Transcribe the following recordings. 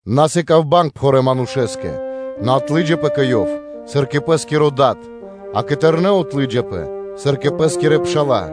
На сыка́в банг пхурэ́ манушэ́скэ, нэ отлыджапэ кэ ёв, сыр кэ пэ́скиро дад, а кэ тэрнэ́ отлыджапэ, сыр кэ пэ́скирэ пша́ла,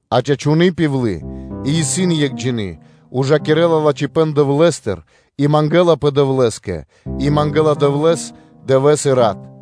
А чачуны́ пивлы и сави́ исын екхджины, ужакирэ́ла лачхипэ́н Дэвлэ́стыр и мангэлапэ Дэвлэ́скэ и мангэ́ла Дэвлэ́с дывэ́с и рат.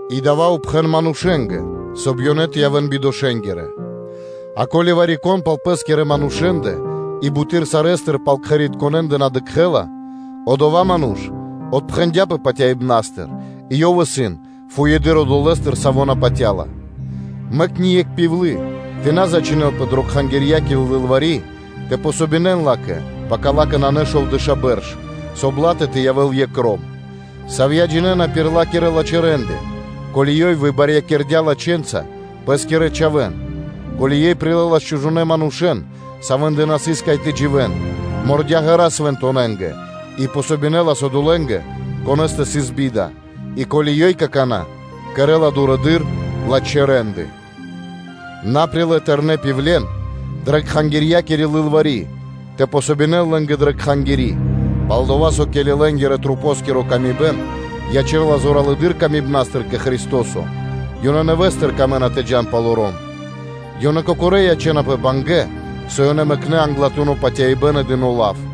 И дава́ пхэн зорья́са манушэ́нгэ, соб (кай) ёнэ тэ явэ́н бидошэнгирэ. А ко́ли вари-кон пал пэ́скирэ манушэ́ндэ и буты́р сарэ́стыр пал кхэритконэндэ на дыкхэ́ла, одова́ ману́ш отпхэндяпэ патяибнастыр и ёв исын фуеды́р одолэ́стыр, саво́ на патя́ла. Мэк ни екх пивлы тэ на зачхинэлпэ дрэ кхангирья́кири лылвари́ тэ помогинэн ла́кэ, пака ла́кэ нанэ шовдэша́ бэрш, соб (кай) ла́тэ тэ явэ́л екх ром, савья́ джинэ́на пир ла́кирэ лачхэ́ рэ́нды, ко́ли ёй выбарьякирдя лачхэнца пэ́скирэ чхавэ́н, ко́ли ёй прилэлас чужонэ́ манушэ́н, савэ́ндэ на сыс, кай тэ дживэ́н, мордя ґэра́ свэнтонэнгэ, и помогинэлас одолэ́нгэ, конэ́стэ сыс би́да, и ко́ли ёй какана́ кэрэ́ла дурэды́р лачхэ́ рэ́нды. На прилэ́ тэрнэ́ пивлен дрэ кхангирья́кири лылвари́ тэ помогинэн лэ́нгэ дрэ кхангири́, пал-дова́ со, ке́ли лэ́нгирэ-масэ́нгиро камибэн ячэ́ла зоралэды́р тырдыпнастыр кэ Христо́со, ёнэ нэвэ́стыр камэ́на тэ джа́н палоро́м. Ёнэ кокорэ́ ячэ́напэ бангэ́, со ёнэ мэкнэ́ англатуно́ патяибэ́н и дыно́ лав.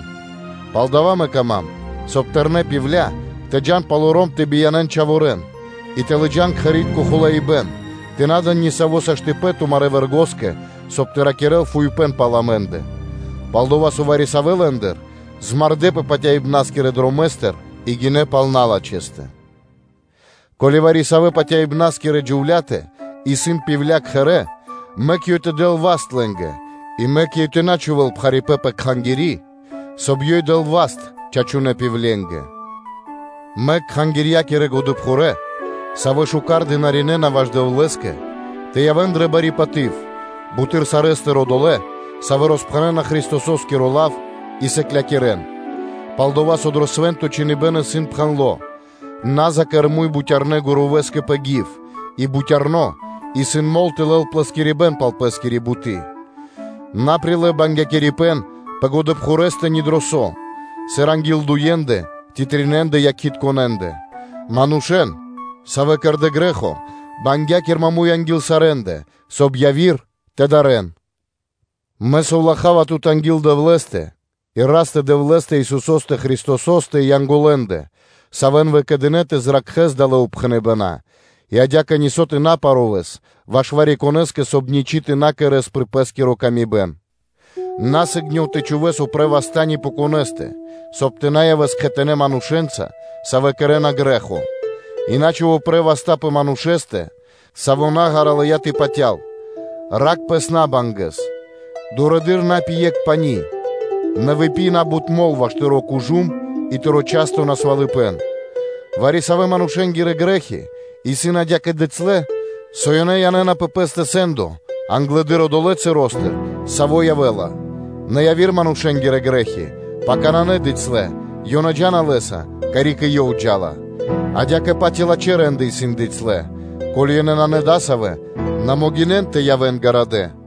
И палдава́ мэ кама́м, соб (кай) тэрнэ́ пивля, тэ джа́н палоро́м тэ биянэн чхаворэ́н, и тэ лыджа́н кхэри́тко хулаибэн, тэ на дэн нисаво́ саштыпэн тумарэ́ вэргоскэ, соб (кай) тэ ракирэ́л фуипэ́н. Пал-дова́ со вари-савэ́ лэ́ндыр змардэпэ патяибнаскирэ дромэ́стыр и гинэ́ пал налачхэстэ. Ко́ли вари-савэ́ патяибнаскирэ джувля́тэ исын пивля (удовы) кхэрэ́, мэк ёй тэ дэл васт лэ́нгэ, и мэк ёй тэ на чхувэ́л пхарипэ́н пэ кхангири́, соб (кай) ёй дэл васт чачунэ́ пивленгэ. Мэк годэпхурэ́ (пхурэды́р пша́ла), савэ́ шука́р дынаринэна ваш Дэвлэ́скэ, тэ явэ́н дрэ бари паты́в, буты́р сарэ́стыр одолэ́, савэ́ роспхэнэна Христосо́скиро лав и сыклякирэ́н; пал-дова́ со дрэ свэ́нто чхиныбэ́н исын пхэндло́: “На закэр муй бутярнэ́ гурувэскэ пэ гив, и бутярно исын мол тэ лэл плэскирибэн пал пэ́скири буты́.” На прилэ́ бангякирибэн пэ годэпхурэстэ (пхурэдырэ пшалэ́стэ) ни дро со, сыр анги́л дуендэ ци тринэндэ якхитконэндэ/ якхалэндэ (свидетелендэ). Манушэ́н, савэ́ кэрдэ́ грэ́хо, бангякир маму́й анги́л сарэ́ндэ, соб (кай) яви́р тэ дарэ́н. Мэ засовлахава тут анги́л Дэвлэ́стэ и Растэ – Дэвлэ́стэ, Исусо́стэ Христосо́стэ и Янголэндэ, савэ́н выкэдынэ́, тэ зракхэс далэ́ упхэныбэна́ и адя́кэ нисо́ тэ на парувэс ваш вари-конэ́скэ, соб (кай) ничы́ тэ на кэрэ́с пир пэ́скиро ило́. На сыгнёв (на яв сы́гно) тэ чхувэ́с упрэ́ васта́ ни пэ конэ́стэ, соб (кай) тумэ́ тэ на явэс кхэтанэ́ манушэ́нца, савэ́ кэрэ́на грэ́хо и на чхув упрэ́ васта́ пэ манушэ́стэ, саво́ наґара лыя́ тэ патял, ракх пэс набангэса (жужэса) Дурэды́р на пи екх пани́, нэ выпи на́бут мол (вино) ваш тыро́ кужум и тыро́ часто насвалыпэн. Вари-савэ́ манушэ́нгирэ грэ́хи исын адя́кэ бицялэ, со ёнэ янэ́на пэ пэ́стэ сэ́ндо англэды́р одолэ́ часостыр, саво́ явэ́ла, нэ яви́р манушэ́нгирэ грэ́хи пака исын набицялэ, ёнэ джа́на лэ́са, карик и ёв джа́ла. Адя́кэ-паць и лачхэ́ рэ́нды исын бицялэ; ко́ли ёнэ нанэ дасавэ́, на могинэн тэ явэ́н ґарадэ́.